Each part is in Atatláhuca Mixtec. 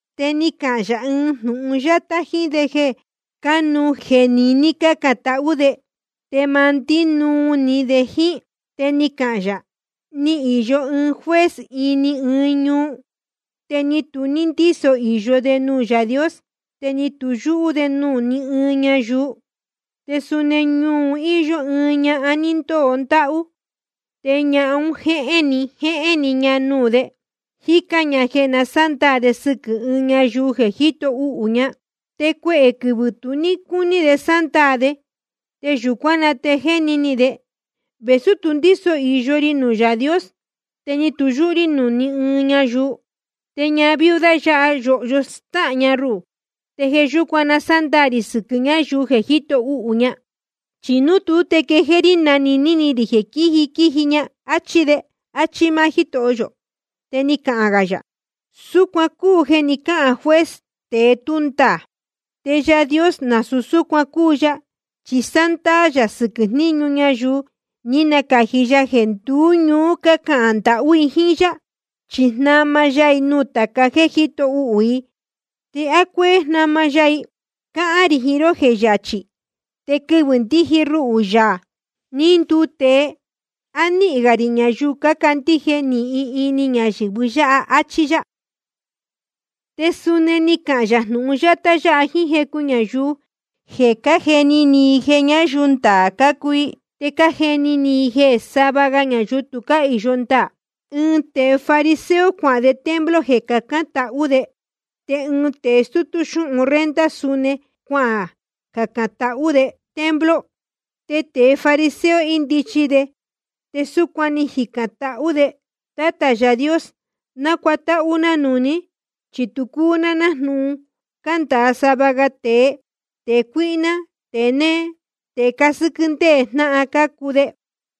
Te ni cahān yā ɨɨn jnūhun yátá jíín de jeē cánuú jeē niní cácān tahú de, te ma ndínuu ni de jíín. Te ni cahān yā: Ni īyo ɨɨn juez ini ɨɨn ñuu. Te ni tu ndíso īyo de nuū Yaā Dios, ni tu yúhú de nuū ní ɨɨn ñayuu. Te suni ñuu un íyó ɨɨn ñahan ní ndóo ndáhú. Te ñahan un jéhén‑ni jéhén‑ni ña nuū de, jícán ña jeē na sándaā de sɨquɨ̄ ɨɨn ñayuu jeē jíto uhū i ña. Te cuehē quɨvɨ̄ tu ní cúní de sándaā de, te yūcuán na te ni jeni ni de: Vēsú tu ndíso īyo ri nuū Yaā Dios, ni tu yúhú rí nuū ní ɨɨn ñayuu, te ñahan viuda yáha, yōhyo stáhān ña ruhū, te jeē yúcuan na sándaā rī sɨquɨ̄ ñáyuu jeē jíto uhū i ña. Chi núu tuú, te quejéé rí jnanīní ni rī jeē quíji quíji ña. Achí de. Achí máá Jítoho yō. Te ni cahān gā yā: Súcuan cúu jeē ni cáhān juez, tēe tú ndaā. Te Yaā Dios, nasūu súcuan cúu ya, chi sándaā yā sɨquɨ̄ jníñu ñayuu ní nacāji ya jeē nduú ñuú cácahān ndahú i jíín yá. Chi jnama ya i nuū tāca jéē cájito uhū i. ¿Te á cuéé jnama ya i? Cáhán rī jiín ró jeē yachī. Te quɨvɨ̄ ndíji ruhū, Yaā ní nduu tēe, ¿á níhīn gā rī ñayuu cácandíje nīhin ini ñayɨ̄vɨ́? Achí yá. Te suni ni cahān yā jnūhun yátá yáha jíín jecu ñayuu jeē cájeni ni i jeē ñáyuu ndaā cácuu i, te cájeni ni i jeē sava ga ñayuu tu cáhīyo ndaā: ɨɨn tēe fariseo cuahān de templo jeē cacān tahú de. Te ɨɨn tēe stútú xúhun renta suni cuacacān tahú de templo. Te tēe fariseo, índichi de, te súcuan ni jicān tahú de: Tátā Yaā Dios, na cútahū na núū ní, chi tu cúu ná nájnūhun cándāa sava ga tēe, tēe cuíhná, tēe néé, tēe cásɨ́quɨ́ ndéē jnáhan cácuu de.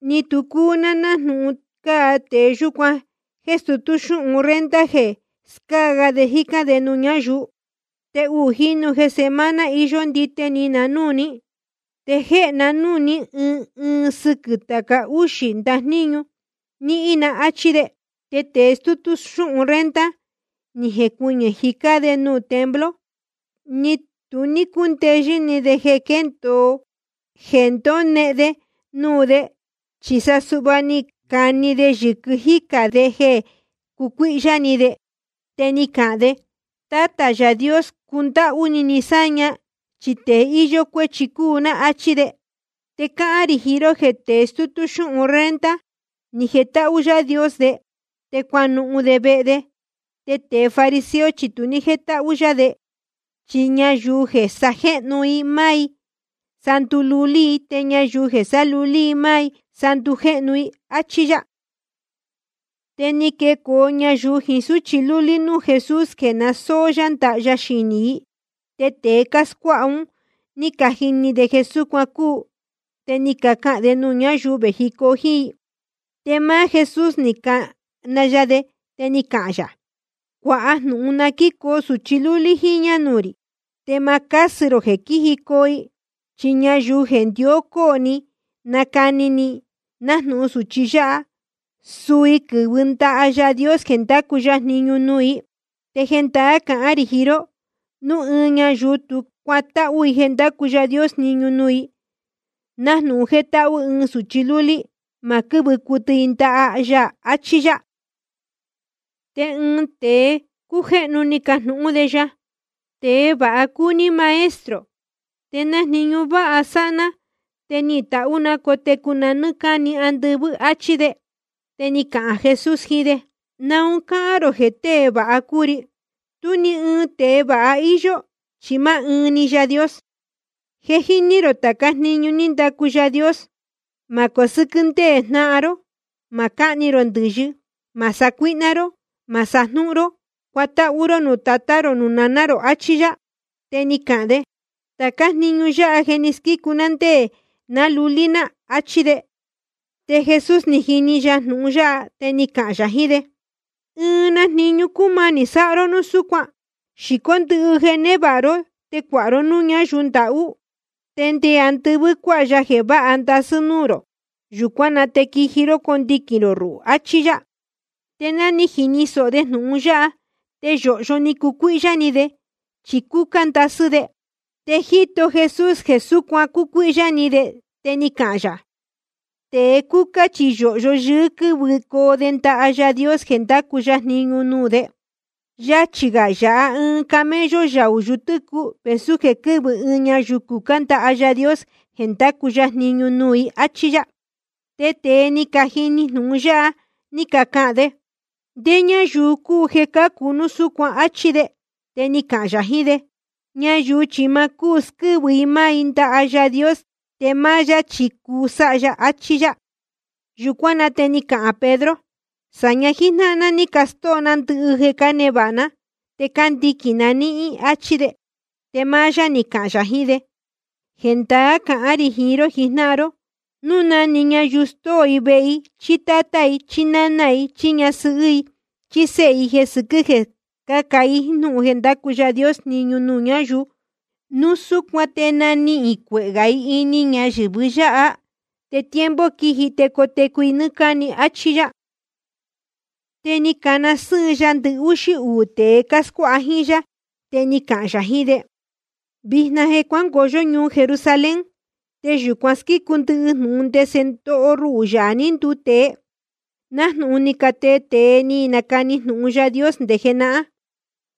Ni tu cúu ná nájnūhun cáa tēe yúcuan jéē stutú xúhun renta jeē scáa ga de jícán de nuū ñáyuu. Te uū jínu jeē semana iyó ndite ni na núū ní, te jéhe ná nuū ní ɨɨn ɨɨn sɨquɨ̄ tāca úxī ndajníñu níhín na, áchí de. Te tēe stútú xúhun renta, ni jecuɨñɨ̄ jicá de nuū templo, ni tu ní chúndeyɨ́ ni de jeē ndonehen de nuū de, chi sa suhva ni cani de yɨ̄quɨ jícā de jeē cucuíhyá ni de. Te ni cahān de: Tátā Yaā Dios, cundáhú ni ni sáña, chi tēe íyó cuéchi cúu ná, áchí de. Te cáhán rī jiín ró jeē tēe stútú xúhun renta, ni jetáhú Yaā Dios de, te cuanuhun de vehe de. Te tēe fariseo chi tu ní jétáhú yá de. Chi ñayuu jeē sajéhnu i máá i, sa ndululí i. Te ñayuu jeē sálulí i máá i, sa ndujéhnu i. Achí yá. Te ni quecoo ñayuu jiín súchi lúlí núū Jesús, jeē na sóó yá ndaha ya xinī i. Te tēe cáscuáha un ní cajini de jeē súcuan cúu, te ni cacahān de nuū ñáyuu vējicoo jíín i. Te máá Jesús ni cana ya de, te ni cahān yā: Cuāha jnūhun na quíjicoo sūchi lúlí jíñā nuū rī, te ma cásɨ rō jeē quíjicoo i. Chi ñayuu jeē ndió cóo ni i cani ni i nájnūhun sūchi yáha, suu i quɨ́vɨ ndaha Yaā Dios jeē ndacu ya jniñu nuū i. Te jendaá cahán rī jiín ró, núu ɨɨn ñayuu tú cuatáhú i jeē ndácu Yaā Dios jniñu nuū i, nájnūhun jétáhú ɨɨn sūchi lúlí, ma quɨ́vɨ cuɨtɨ i ndaha ya, achí yá. Te ɨɨn tēe cújéhnu ni cajnūhún de ya: Tēe vāha cúu ní Maestro. ¿Te na jniñu váha sáha ná te nihīn tahú na cotecu na nɨ́ɨ́ cáni andɨvɨ́? Achí de. Te ni cahān Jesús jiín de: ¿Naun cáhán rō jeē tée vāha cúu ri? Tú ni ɨɨn tēe vāha íyó, chi máá ɨɨn‑ni Yaā Dios. Je jíní rō tācá jniñu ní ndacu Yaā Dios: Ma cosɨ́quɨ́ ndéē jnáhan ró. Ma cáhni rō ndɨ̄yɨ. Ma sacuíhná ró. Ma sajnúhún ró. Cuatáhú ró nuū tatá rō nuū naná rō. Achí yá. Te ni cahān maá de: Tācá jniñu yáha je ni squícu ná ndé ná lulí ná, achí de. Te Jesús ni jini ya jnūhun yáha, te ni cahān yā jiín de: Ɨɨn na jniñu cúmanī sáha ró núu súcuan. Xīcó ndɨhɨ jeē névāha ró, te cuāha ró núū ñáyuu ndahú. Te nde andɨvɨ́ cuāha ya jeē váha ndasɨ́ núū rō. Yūcuán na te quiji ró condiquīn rō ruhū, achí yá. Te ná ni jini sōho de jnūhun yáha, te yōhyo ni cucuíhyá ni de, chi cúcá ndasɨ́ de. Te jíto Jesús jeē súcuan cúcuíhyá ni de, te ni cahān yā: Tēe cúcá chi yōhyo yɨɨ́ quɨ́vɨcoo de ndaha Yaā Dios jeē ndacu ya jniñu nuū de. Yachī gā yāha ɨɨn camello yaū yutɨ́cuɨ vēsú jeē quɨ́vɨ ɨɨn ñayuu cucá ndaha Yaā Dios jeē ndacu ya jniñu nuū i, áchí yá. Te tēe ní cajini jnūhun yáha, ní cacahān de: ¿Ndé ñáyuu cúu jeē cácu núu súcuan? Achí de. Te ni cahān yā jiín de: Ñayuu chi ma cúu squɨ́vɨ i máá i ndaha Yaā Dios, te máá yá chi cuu sáha ya, achí yá. Yūcuán na te ni cahān Pedro: Sāña jíjnáhan ná ní castóo ná ndɨhɨ jeē cánevāha ná, te cándiquīn na níhín, áchí de. Te máá yá ni cahān yā jiín de: Jendaá cahán rī jiín ró jijnáhan ró, núu na‑ni ñayuu stóo i vehe, chí tátá, chí ñani, chí ñasɨhɨ́, chí séhe, jeē sɨquɨ́ jeē scáca i jnūhun jeē ndácu Yaā Dios jniñu nuū ñáyuu, núu súcuan te nanihīn cuehē gā i ini ñayɨ̄vɨ yáha, te tiempo quiji te cotecu i nɨ́ɨ́ cáni, áchí yá. Te ni cana sɨ́ɨn ya ndɨhúxí uū tēe cáscuáha jíín yá, te ni cahān yā jiín de: Vijna je cuángoo yó ñuu Jerusalén. Te yūcuan squícu ndɨhɨ jnūhun ndese ndoho ruhū, Yaā ní nduu tēe, nájnūhun ni catee tēe ni canacani jnūhun Yaā Dios nde jenahán.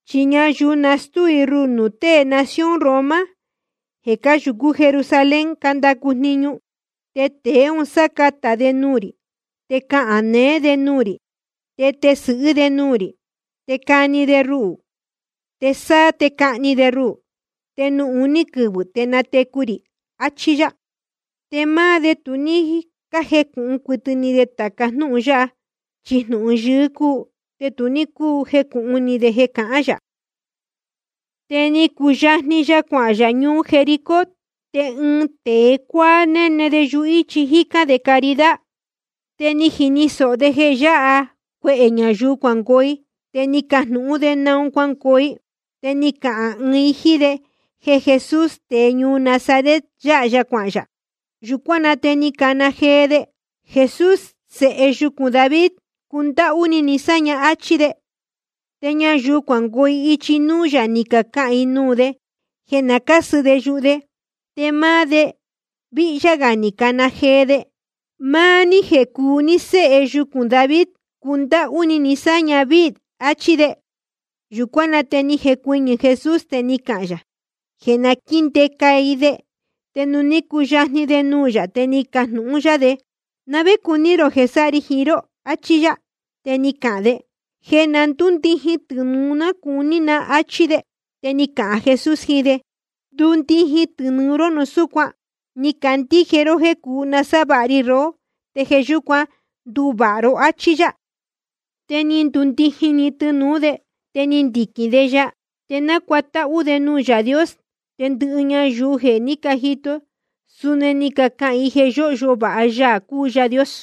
Chi ñayuu nastúu i ruhū nuū tée nación Roma jeē cáyūcú Jerusalén cándacu jniñu. Te tēe un sácatā de nuū rī, te cahān neé de nuū rī, te tesɨ̄hɨ́ de nuū rī. Te cani de ruhū, te sáá te cahni de ruhū. Te nuū uní quɨvɨ̄ te natecu rī. Achí yá. Te máá de tu ní cájecūhun cuɨtɨ ni de tāca jnúhun yáha. Chi jnūhun yɨɨ́ cúu, te tu ní cúu jecūhun ni de jeē cahán yā. Te ni cuyajni ya cuahān yā ñuu Jericó. Te ɨɨn tēe cuáá néne de yuhíchi, jícán de caridad. Te ni jini sōho de jeē yáha cuehē ñayuu cuangoo i, te ni cajnūhún de naun cuángoo i. Te ni cacahān i jíín de jeē Jesús, tēe ñuu Nazaret, yáha ya cuahān yā. Yūcuán na te ni cana jee de: Jesús Sēhe yucūn David, cundáhú ni ni sáña, áchí de. Te ñayuu cuangoo ichi núú yā, ni cacahān i nuū de jeē na cásɨ de yuhu de. Te máá de víhyá gā ni cana jee de: Máá ní jeē cúu ní Séhe yucūn David, cundáhú ni ni sáña víī, achí de. Yūcuán na te ni jecuɨñɨ̄ Jesús, te ni cahān yā jeē na quíndeca i de. Te nuū ní cuyajni de nuū yā, te ni cajnūhun yá de: ¿Na vé cuní rō jeē sáha ri jiín ró? achí yá. Te ni cahān de: Jeē na ndúndijin tɨnūu ná cuní na, áchí de. Te ni cahān Jesús jiín de: Ndundijin tɨnūu ró núu súcuan. Ni candíje ró jeē cuu nasávāha ri rohó, te jeē yúcuan ní nduvāha ró, áchí yá. Te ni ndundijin‑ni tɨnūú de, te ni ndiquīn de ya, te nácuatáhú de nuū Yaā Dios. Te ndɨhɨ ñayuu jeē ní cajito i, suni ni cacahān i jeē yóhyo vāha Yaā cúu Yaā Dios.